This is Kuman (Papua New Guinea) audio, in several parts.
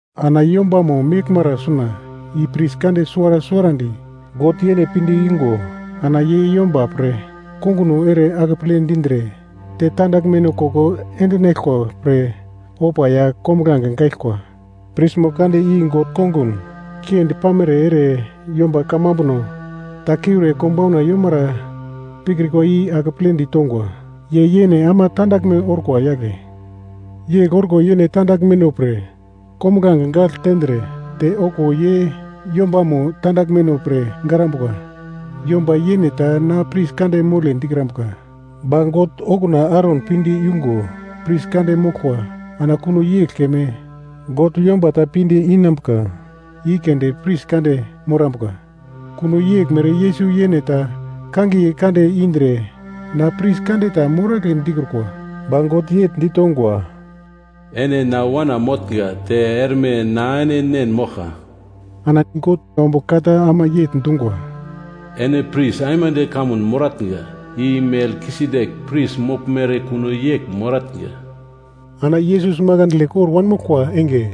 Ana yombamo meglmara suna i pris kande suwara suwarandi God yene pinde igo ana ye yomba pre konguno ere akeple dindre te tandaglmeno koko endinaglkwa pre ofa ya kombuglange gaglkwa. Prismo kande i God kongun kiendi pamere ere yomba kamambuno ta kiure konbauna yomara pikrikwa i akeple ditongwa. Ye yene ama tandaglme orkwa yagle. Yegl orko yene tandaglmeno pre kombuglange gagl tendre, te okuwo ye yombamo tandaglmeno pre garambuka. Yomba yene ta na pris kande mole dikrambuka, ba God okuna Aron pinde yungo pris kande moglkwa ana kuno yegl keme God yomba ta pinde inambuka i keunde pris kande morambuka. Kuno yeglmere Yesus yene ta kangiye kande indre na pris kande ta moragle dikrukwa. Ba God yegl ditongwa, “Ene na Wana motnga te erme na ene Nen moglkwa.” Ana God ombugl ka ta ama yegl dungwa, “Ene pris aimande kamun moratnga, i Melkisedek pris moglmere kuno yegl moratnga.” Ana Yesus makandle kor wanmoglkwa enge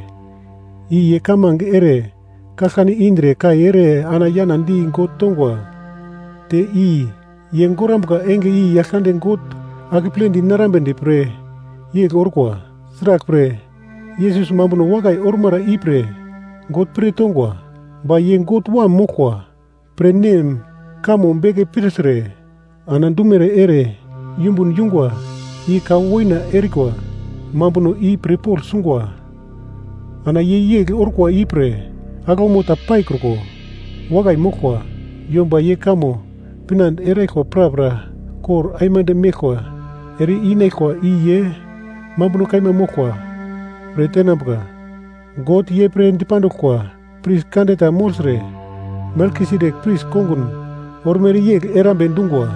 i ye kamange ere kaglkane indre kai ere ana yana di God tongwa, te i ye gorambuka enge i Yaglkande God akeple dinarambedi pre yegl orkwa. Sraglpre Yesus mambuno wakai ormara ipre God pir tongwa. Ba ye God Wam moglkwa pre Nem kamo beke pirtre ana dumere ere yumbun yungwa i ka woina erikwa mambuno i pir pogl sungwa. Ana ye yegl orkwa ipre aglaumo ta paikruko wakai moglkwa. Yomba ye kamo pinande eraglkwa prapra kor aimande meglkwa ere-inaglkwa i ye mambuno kaima moglkwa pre tenambuka. God ye pre dipanduglkwa, pris kande ta mogltre Melkisedek pris kongun ormere yegl erambe dungwa.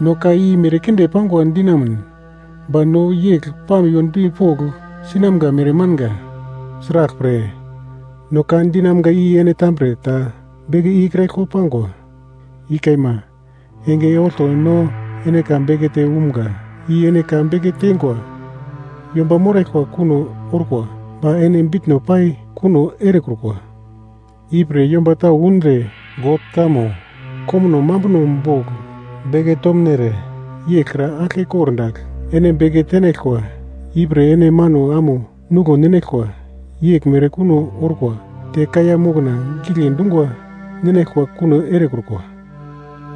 No ka i merkinde pangwa dinamun, ba no yegl pamiwo dipogl sinamga mere manga, sraglpre, no ka dinamga i ene tambre ta beke ikraglkwa pangwa. I kaima, enge olto no ene ka bekete umga i ene ka beke teingwa yomba moraglkwa kuno orkwa ba ene bitno pai kuno erekrukwa, ipre yomba tau undre God kamo komuno mambuno bogl beke tomnere yeglkra aglke kordagl ene beke tenaglkwa, ipre ene mano amo nuglo ninaglkwa yeglmere kuno orkwa te kaiya mokna gigle dungwa ninaglkwa kuno erekrukwa.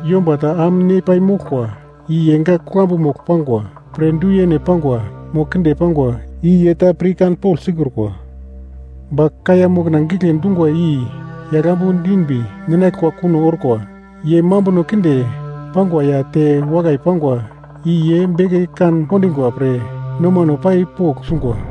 Yomba ta am ne pai moglkwa i ye gak kuglambu mogl pangwa pre du-yene pangwa mo kinde pangwa i ye ta pirkanpogl sikrukwa. Ba kaiya mokna gigle dungwa i yagl ambu dinbi ninaglkwa kuno orkwa. Ye mambuno kinde pangwa ya te wakai pangwa i ye beke kan-kondingwa pre nomano pai pogl sungwa.